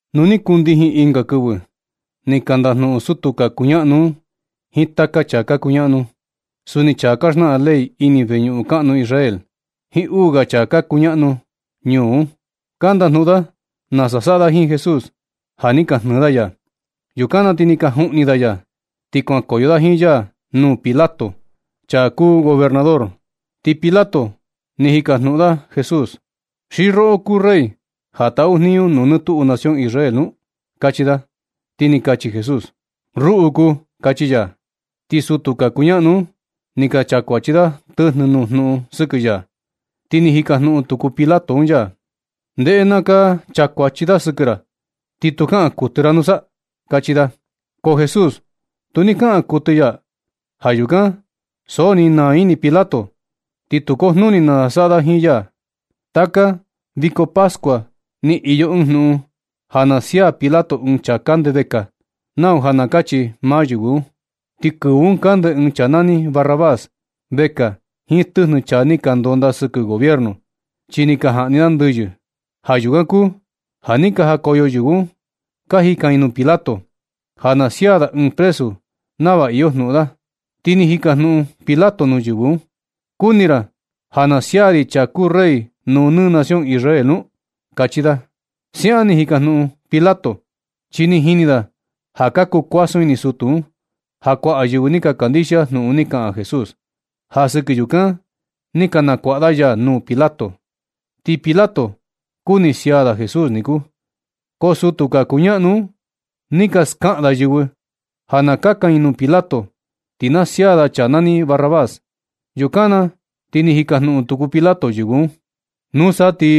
Nu ni kundijin ɨnga kɨvɨ, ni ka ndajnuꞌun sutu ka kuñaꞌnu un jiin taka chaa ka kuñaꞌnu, suni chaa ka xnaꞌan ley ini veñuꞌun kaꞌnu Israel, jiin uu ga chaa ka kuñaꞌnu ñuu un. Ka ndajnuꞌun da nasa saꞌa da jiin Jesús, ja ni ka jnɨɨ da ya. Yukan na ti ni ka juꞌni da ya, ti kuankoyo da jiin ya nuu Pilato, chaa kuu gobernador. Ti Pilato ni jikajnuꞌun da Jesús: ―¿Xi roꞌo kuu Rey, ja taꞌu jniñu nuu nɨ tuꞌu nación Israel nu? ―kachi da. Ti ni kachi Jesús: ―Ruꞌu kuu ―kachi ya. Ti sutu ka kuñaꞌnu un ni ka chakuachi da tɨjnɨ nuu jnuꞌun sɨkɨ ya. Ti ni jikajnuꞌun tuku Pilato un ya: ―Ndeꞌe na ka chakuachi da sɨkɨ ra, ¿ti tu kaꞌan kuɨtɨ ra nusa? ―kachi da. Ko Jesús tu ni kaꞌan kuɨtɨ ya. Ja yukan na ti so ni naa ini Pilato, ti tu kujnuni nasa saꞌa da jiin ya. Taka viko pascua ni iyo ɨɨn jnuꞌun ja na sia Pilato ɨɨn chaa kande vekaa, nau ja na kachi maa yɨvɨ un. Ti kɨvɨ un kande ɨɨn chaa nani Barrabás vekaa jiin tɨjnɨ chaa ni ka ndonda sɨkɨ gobierno, chi ni ka jaꞌni da ndɨyɨ. Ja yukan kuu ja ni ka jakoyo yɨvɨ un ka jikan i nuu Pilato, ja na sia da ɨɨn presu nava iyo jnuꞌun da. Ti ni jikajnuꞌun Pilato nuu yɨvɨ un: ―¿Kuni ra naa ra ja na sia ri chaa kuu Rey nuu nɨ nación Israel nu? ―kachi da. Siaꞌan ni jikajnuꞌun Pilato, chi ni jini da ja ka kuu kuasun ini sutu un, ja kuaꞌa yɨvɨ ni ka kandixia jnuꞌun ni kaꞌan Jesús. Ja sɨkɨ yukan ni ka nakuaꞌa da ya nuu Pilato, ti Pilato kuni sia da Jesús niku. Ko sutu ka kuñaꞌnu un ni ka skaꞌan da yɨvɨ ja na kakan i nuu Pilato, ti na sia da chaa nani Barrabás. Yukan na ti ni jikajnuꞌun tuku Pilato yɨvɨ un: ―Nusa ti,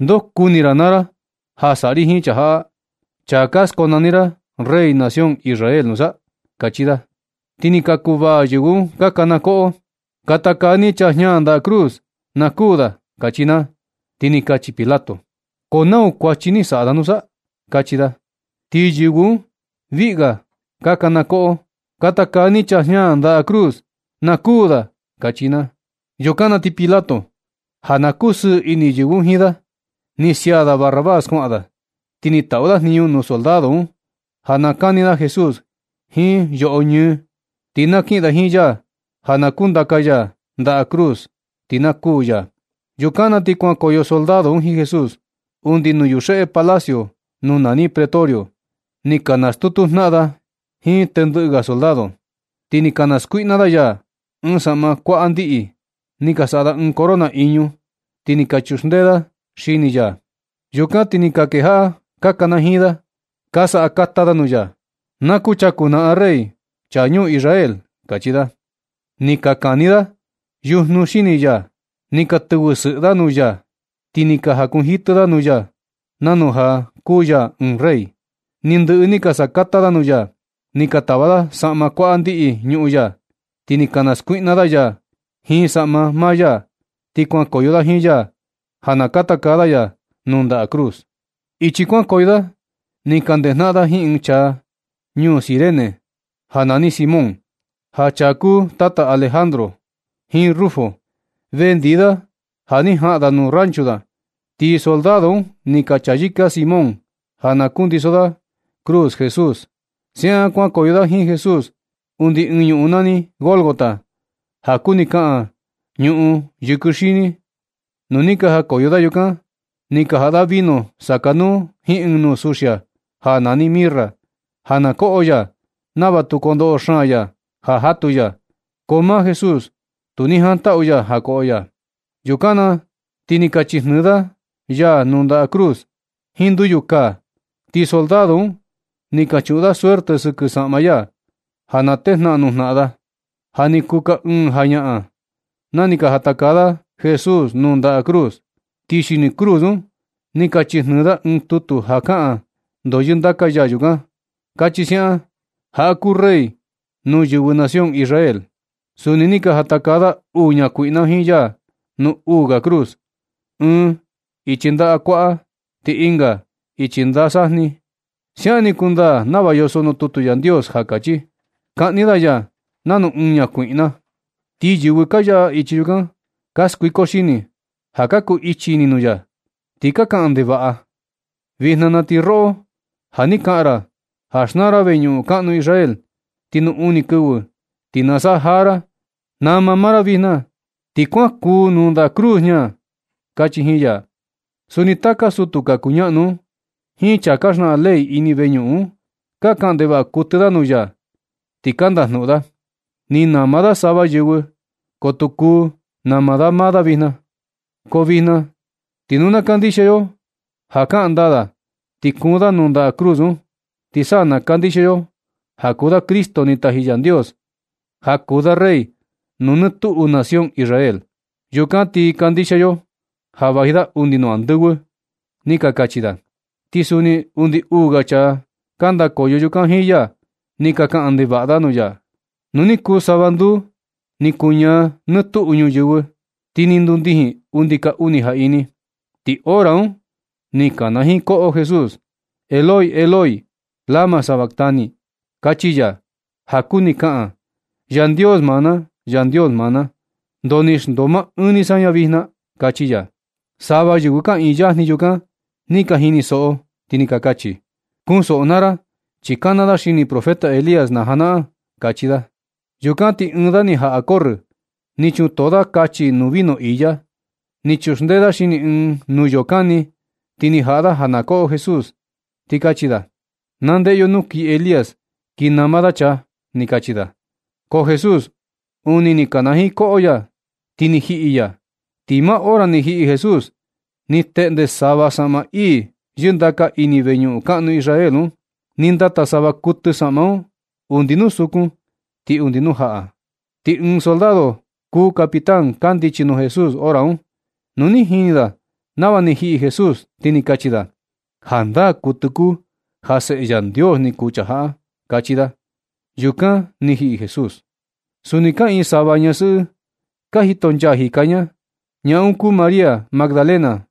¿ndoo kuni ra naa ra ja saꞌa ri jiin chaa jaꞌa, chaa ka skonani ra Rey nación Israel nusa? ―kachi da. Ti ni ka kuvaa yɨvɨ un ka kana koꞌo: ―¡Katakaa ni chaa jña ndaꞌa cruz, na kuū da! ―kachi naa. Ti ni kachi Pilato: ―¿Ko nau kuachi ni saꞌa da nusa? ―kachi da. Ti yɨvɨ un viꞌi ga ka kana koꞌo: ―¡Katakaa ni chaa jña ndaꞌa cruz, na kuū da! ―kachi naa. Yukan na ti Pilato, ja na kusɨɨ ini yɨvɨ un jiin da, ni sia da Barrabás kuaꞌan da. Ti ni taꞌu da jniñu nuu soldado un ja na kani da Jesús jiin yoꞌo ñɨɨ, ti na kiꞌin da jiin ya ja na kundaka ya ndaꞌa cruz, ti na kuū ya. Yukan na ti kuankoyo soldado un jiin Jesús undi nuu yuxeꞌe palacio nuu nani Pretorio. Ni ka nastutu jnaꞌan da jiin tendɨꞌɨ ga soldado. Ti ni ka naskuiꞌna da ya ɨɨn saꞌma kuaꞌa ndiꞌi. Ni ka saꞌa da ɨɨn corona iñu, ti ni ka chuxndee da xini ya. Yukan ti ni ka kejaꞌa ka kanajiin da, ka sakata da nuu ya: ―Na kuchaku naꞌan Rey, chaa ñuu Israel ―kachi da. Ni ka kani da yujnu xini ya, ni ka tɨvɨ sɨꞌɨ da nuu ya, ti ni ka jakunjitɨ da nuu ya, nanu ja kuu ya ɨɨn rey. Ni ndɨꞌɨ ni ka sakata da nuu ya, ni ka tava da saꞌma kuaꞌa ndiꞌi ñuꞌun ya, ti ni ka naskuiꞌna da ya jiin saꞌma maa ya. Ti kuankoyo da jiin ya ja ka taka da ya nuu ndaꞌa cruz. Ichi kuankoyo da ni ka ndejanaꞌan da jiin ɨɨn chaa ñuu Cirene nani Simón, ja chaa kuu tata Alejandro jiin Rufo, vendi da ja ni jaꞌan da nuu rancho da, ti soldado un ni ka chayɨka Simón ja na kundiso da cruz Jesús. Siaꞌan kuankoyo da jiin Jesús undi ɨɨn ñuꞌun nani Gólgota, ja kuni kaꞌan, “ñuꞌun yɨkɨ xini.” Nu ni ka jakoyo da yukan, ni ka jaꞌa da vino sakanuu jiin ɨɨn nuu suxia ja nani mirra, ja na koꞌo ya nava tu kondoꞌo xaan ya ja jatu ya. Ko maa Jesús tu ni jantaꞌu ya ja koꞌo ya. Yukan na ti ni ka chijnɨɨ da ya nuu ndaꞌa cruz jiin nduyukaa. Ti soldado un ni ka chuꞌun da suerte sɨkɨ saꞌma ya, ja na tejnaꞌan nuu jnaꞌan da. Ja ni kuu ka ɨɨn jañaꞌan na ni ka jatakaa da Jesús nuu ndaꞌa cruz. Ti xini cruz un ni ka chijnɨɨ da ɨɨn tutu ja kaꞌan ndoo yɨndaka ya yukan. Kachi siaꞌan: “Jaꞌa kuu Rey nuu yɨvɨ nación Israel.” Suni ni ka jatakaa da uu ñakuiꞌna jiin ya nuu uu ga cruz, ɨɨn ichi ndaꞌa kuaꞌa, ti ɨnga ichi ndaꞌa sajni ya. Siaꞌan ni kundaa nava yoso nuu tutu Yandios ja kachi: “Kaꞌni da ya nanu ɨɨn ñakuiꞌna.” Ti yɨvɨ ka yaꞌa ichi chukan, ka skuiko xini ja ka kuu ichi ini nuu ya, ti ka kaꞌan ndevaꞌa: ―Vijna na ti roꞌo ja ni kaꞌan ra ja xnaa ra veñuꞌun kaꞌnu Israel, ti nuu uni kɨvɨ ti na saꞌa jaa ra. Nama maa ra vijna, ti kuan kuun nuu ndaꞌa cruz jña ―kachi jiin ya. Suni taka sutu ka kuñaꞌnu un jiin chaa ka xnaꞌan ley ini veñuꞌun un, ka kaꞌan ndevaꞌa kuɨtɨ da nuu ya, ti ka ndajnuꞌun da: ―Ni nama da sava yɨvɨ, ko tu kuu nama da maa da vijna. Ko vijna ti nu na kandixia yo ja kaꞌan ndaa da ti kuun da nuu ndaꞌa cruz un, ti sa na kandixia yo ja kuu da Cristo ni taji Yandios, ja kuu da Rey nuu nɨ tuꞌu nación Israel. Yukan ti kandixia yo ja vaji da undi nuu andɨvɨ ―ni ka kachi da. Ti suni undi uu ga chaa ka ndakoyo yukan jiin ya, ni ka kaꞌan ndevaꞌa da nuu ya. Nu ni kuu sava nduu, ni kuñaa nɨ tuꞌu ñuyɨvɨ, ti ni ndundijin undi ka uni jaꞌini. Ti hora un ni kanajiin koꞌo Jesús: ―Eloi, Eloi, ¿lama sabactani? ―kachi ya. (Ja kuni kaꞌan: “Yandios maa na, Yandios maa na, ¿ndoo ni xndoo maa ɨɨn ni saña vijna”? ―kachi ya.) Sava yɨvɨ kaꞌiin yajni yukan ni ka jinisoꞌo, ti ni ka kachi: ―Kunsoꞌo naa ra, chi kana da xini profeta Elías na janaꞌan―kachi da. Yukan ti ɨɨn da ni jaꞌa corrɨ, ni chutoo da kachi nuu vino iya, ni chuxndee da xini ɨɨn nuyoo kani, ti ni jaꞌa da ja na koꞌo Jesús, ti kachi da: ―Na ndeꞌe yo nu kii Elías kii nama da chaa ―ni kachi da: Ko Jesús, uni ni kanajiin koꞌo ya, ti ni jiꞌi ya. Ti maa hora ni jiꞌi Jesús, ni teꞌnde sava saꞌma ii yɨndaka ini veñuꞌun kaꞌnu Israel un, ni ndata sava kuɨtɨ saꞌma un undi nuu sukun ti undi nuu jaꞌa. Ti ɨɨn soldado kuu capitán kandichi nuu Jesús hora un. Nu ni jini da nava ni jiꞌi Jesús, ti ni kachi da: ―Jandaa kuɨtɨ kuu ja Seꞌe Yandios ni kuu chaa jaꞌa ―kachi da. Yukan ni jiꞌi Jesús. Suni kaꞌiin sava ñasɨꞌɨ ka jitonchaa jika ña. Ñaa un kuu María Magdalena,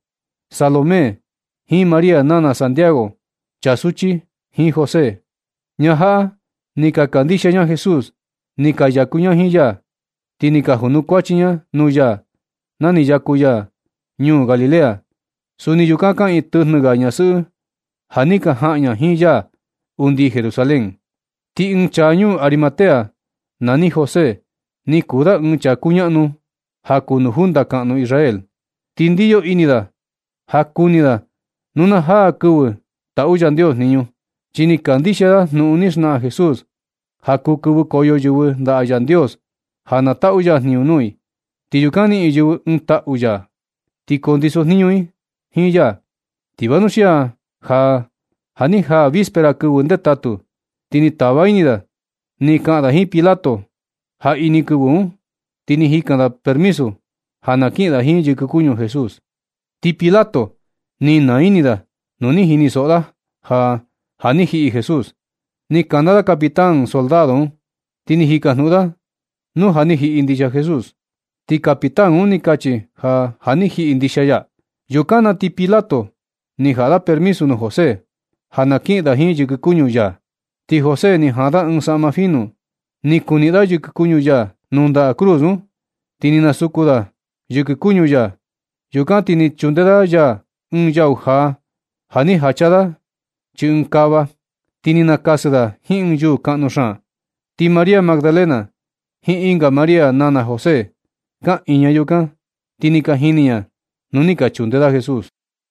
Salomé, jiin María nana Santiago, chaa suchi, jiin José. Ñaa jaꞌa ni ka kandixia ña Jesús. Ni ka yaku ña jiin ya, ti ni ka junukuachi ña nuu ya na ni yaku ya ñuu Galilea. Suni yukan kaꞌiin tɨjnɨ ga ñasɨꞌɨ ja ni ka jaꞌan ña jiin ya undi Jerusalén. Ti ɨɨn chaa ñuu Arimatea, nani José, ni kuu da ɨɨn chaa kuñaꞌnu ja kuu nuu junta kaꞌnu Israel. Ti ndiyo ini da ja kuni da nu na jaa kɨvɨ taꞌu Yandios jniñu. Chi ni kandixia da jnuꞌun ni xnaꞌan Jesús ja kuu kɨvɨkoyo yɨvɨ ndaꞌa Yandios ja na taꞌu ya jniñu nuu i, ti yukan niꞌin yɨvɨ un ɨɨn taꞌu ya ti kundisojniñu i jiin ya. Ti vanuxia ja ni jaa vispera kɨvɨ ndetatu, ti ni tava ini da ni kaꞌan da jiin Pilato jaꞌini kɨvɨ un, ti ni jikan da permiso ja na kiꞌin da jiin yɨkɨ kuñu Jesús. Ti Pilato ni naa ini da nu ni jinisoꞌo da ja, ja ni jiꞌi Jesús. Ni kana da capitán soldado un, ti ni jikajnuꞌun da nu ja ni jiꞌi ndixia ya. Ti capitán un ni kachi ja, ja ni jiꞌi ndixia ya. Yukan na ti Pilato ni jaꞌa da permisu nuu José ja na kiꞌin da jiin yɨkɨ kuñu ya. Ti José ni jaan da ɨɨn saꞌma finu, ni kuniꞌin da yɨkɨ kuñu ya nuu ndaꞌa cruz un, ti ni nasuku da yɨkɨ kuñu ya. Yukan ti ni chunde da ya ɨɨn yau jaa, ja ni jacha da chii ɨɨn kava. Ti ni nakasɨ da jiin ɨɨn yuu kaꞌnu xaan. Ti María Magdalena jiin ɨnga María nana José, kaꞌiin ña yukan, ti ni ka jini ña nuu ni ka chunde da Jesús.